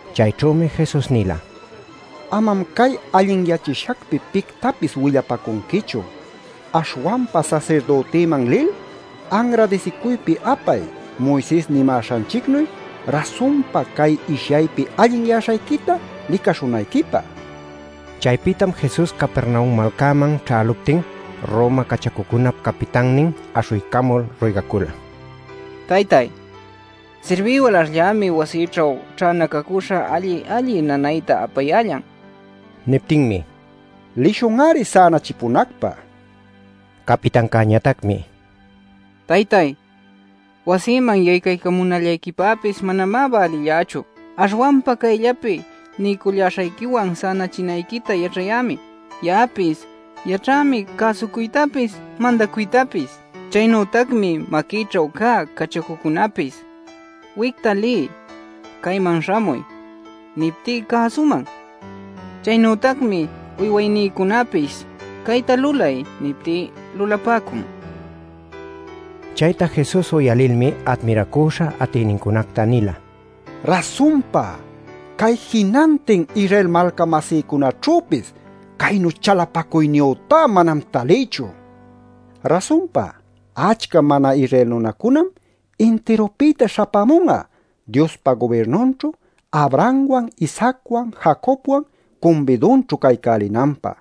Chayćhümi Jesus nila: “Amam cay allinyachishacpi pictapis willapacunquichu. Aśhwanpa sasirdütiman lil, anradisicuypi apay Moises nimäśhanchicnuy, rasunpa cay ishyaypi allinyäśhayquita licaśhunayquipä” nil. Chaypïtam Jesus Capernaum malcäman ćhäluptin Roma cachacucunap capitannin aśhuycamul ruygacula: “Taytay, sirbï walaśhllämi wasïćhu ćhänacacüśha alli-alli nanayta apayällan” nil. Niptinmi: “Lishun-ari sänachipunacpä” nila. Capitancäñatacmi: “Taytay, wasïman yaycaycamunallayquipäpis manamá bälillächu. Aśhwanpa cayllapi niycullaśhayquiwan sänachinayquita yaćhayämi. Ya'apis yaćhämi cäsucuytapis mandacuytapis. Chaynütacmi maquïćhu cä cachacucunäpis ‘wicta liy’, ‘cayman śhamuy’ niptí cäsuman. Chaynütacmi uywaynïcunapis ‘cayta lulay’ niptí lulapäcun” nila. Chayta Jesus uyalilmi admiracüśha atïnincunacta nila: “¡Rasunpa, cay jinantin Israel malca-masïcunaćhüpis caynu chalapacuyniyütá manam talïchu! Rasunpa achca mana-Israel nunacunam intirupïta śhapämun'a, Diospa gubirnunćhu Abrahamwan, Isaacwan, Jacobwan cumbidunćhu caycälinanpä.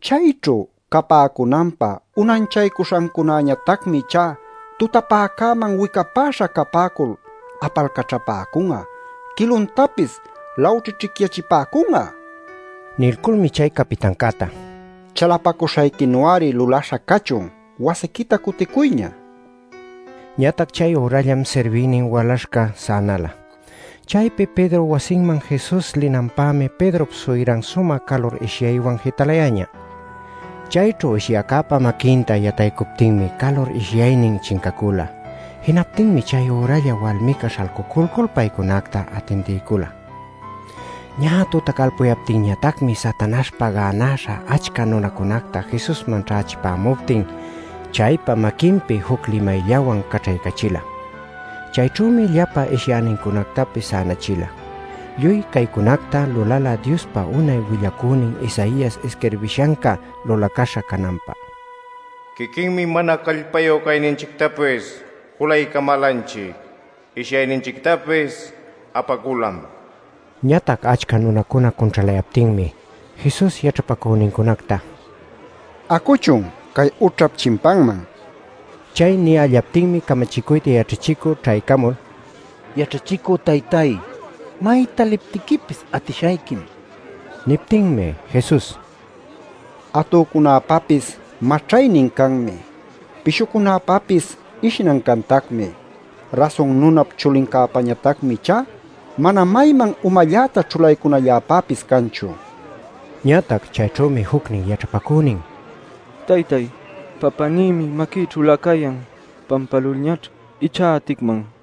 Chayćhu capäcunanpä unanchaycuśhancunañatacmi ichá tutapäcäman wicapäśha capäcul apalcaćhapäcun'a, quiluntapis lawćhićhicyachipäcun'a” nil. Nilculmi chay capitancäta: “Chalapacuśhayquinu-ari lulaśha cachun; wasiquita cuticuyña” nila. Ñatac chay ürallam sirbïnin walaśhca sänäla. Chaypi Pedrop wasinman Jesus linanpämi Pedrop suyran sumä calur ishyaywan jitalayäñä. Chayćhu ishyäcäpa maquinta yataycuptinmi calur ishyaynin chincacula. Jinaptinmi chay üralla walmica śhalcuculcul paycunacta atindiycula. Ñä tutacalpuyaptinmi Satanaśhpa gänaśha achca nunacunacta Jesusman ćhächipämuptin chaypa maquinpi juc limayllawan caćhaycachila. Chayćhümi llapa ishyäcunactapis sänachila. Lluy caycunacta lulala Diospa unay willacünin Isaias isquirbishanca lulaśha cananpä: “Quiquinmi mana callpayu cayninchictapis julaycamälanchic. Ishyayninchictapis apaculam” nil. Ñatac achca nunacuna cunćhalayaptinmi Jesus yaćhapacünincunacta: “Acuchun cay ućhap chimpanman” nila. Chay niyällaptinmi camachicuyta yaćhachicü ćhaycamul: “Yaćhachicü taytay, mayta liptiquipis atishayquim” nin. Niptinmi Jesus: “Atücunäpäpis maćhaynin canmi. Pishucunäpapis ishnan cantacmi. Rasun Nunap Chulincäpañatacmi ichá mana mayman umalläta ćhulaycunalläpäpis canchu” nin. Ñatac chayćhümi jucnin yaćhapacünin: “Taytáy, papänïmi maquïćhülä cayan. Pampälulñaćh ichá aticman” nin.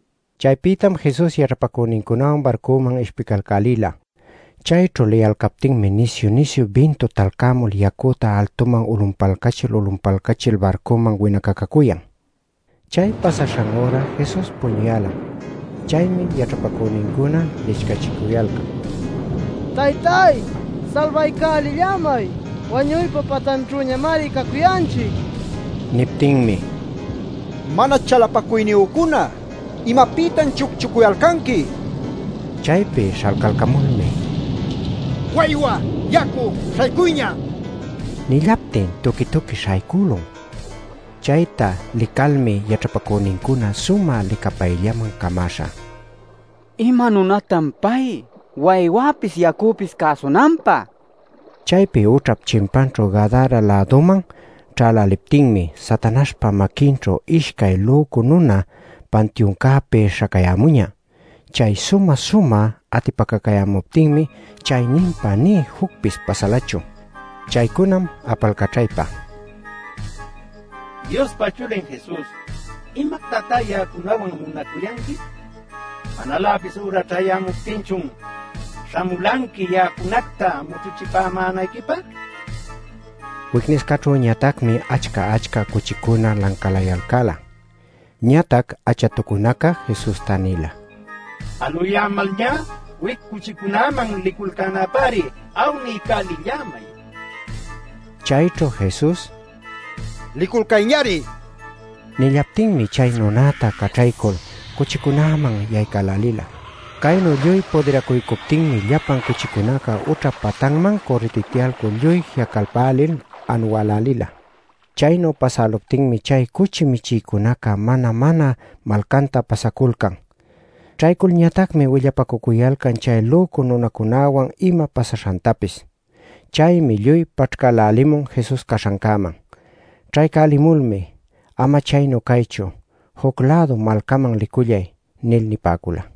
Chaypïtam Jesus yaćhapacünincunawan barcuman ishpicalcälila. Chayćhu liyalcaptinmi nisyu-nisyu bintu talcämul yacüta altuman ulunpalcachil ulunpalcachil barcuman winacacacuyan. Chay pasaśhan üra Jesus'a puñuyälam. Chaymi yaćhapacünincuna lichcachicuyalcan: “¡Taytay salbaycälillämay! ¡Wañuypa patanćhüñamari cacuyanchic!” nil. Niptinmi: “Mana chalapacuyniyücuna, ¿imapïtan chucchucuyalcanqui?” nila. Chaypi śhalcalcamulmi “¡Waywa, yacu, śhaycuyña!” nillaptin tuqui-tuqui śhaycülun. Chayta licalmi yaćhapacünincuna sumä licapayllaman camäśha: “¿Ima nunatan pay, waywäpis yacüpis cäsunanpä?” nicuyalcan. Chaypi ućhap chimpanćhu Gadara-läduman ćhäläliptinmi, Satanaśhpa maquinćhu ishcay lücu nuna pantiuncäpi śhacayämuñä. Chay sumä-sumä atipacacayämuptinmi chayninpa nï jucpis pasalachu. Chaycunam apalcaćhaypa: “Diospa Chulin Jesus, ¡¿imactatá ya'acunawan munacuyanqui?! ¿Manaläpis üra ćhayämuptinchun śhamulanqui ya'acunacta mućhuchipämänayquipä?” nicuyalcan. Wicniscaćhüñatacmi achca-achca cuchicuna lancalayalcäla. Ñatac achatucunaca Jesusta nila: “Aluyämalñá, wic cuchicunäman liculcänapäri awniycälillämay” nil. Chayćhu Jesus: “Liculcayñari” nillaptinmi chay nunäta caćhaycul cuchicunäman yaycälälila. Caynu lluy pudiracuycuptinmi llapan cuchicunaca ućhap patanman cürritityalcul lluy ji'acalpälil anuälälila. Chaynu pasäluptinmi chay cuchi michïcunaca mana-mana malcanta pasaculcan. Ćhayculñatacmi willapacucuyalcan chay lücu nunacunäwan ima pasaśhantapis. Chaymi lluy paćhcälälimun Jesus caśhancäman. Ćhaycälimulmi: “Ama chaynu caychu. Juc-lädu malcaman licullay” nil nipäcula.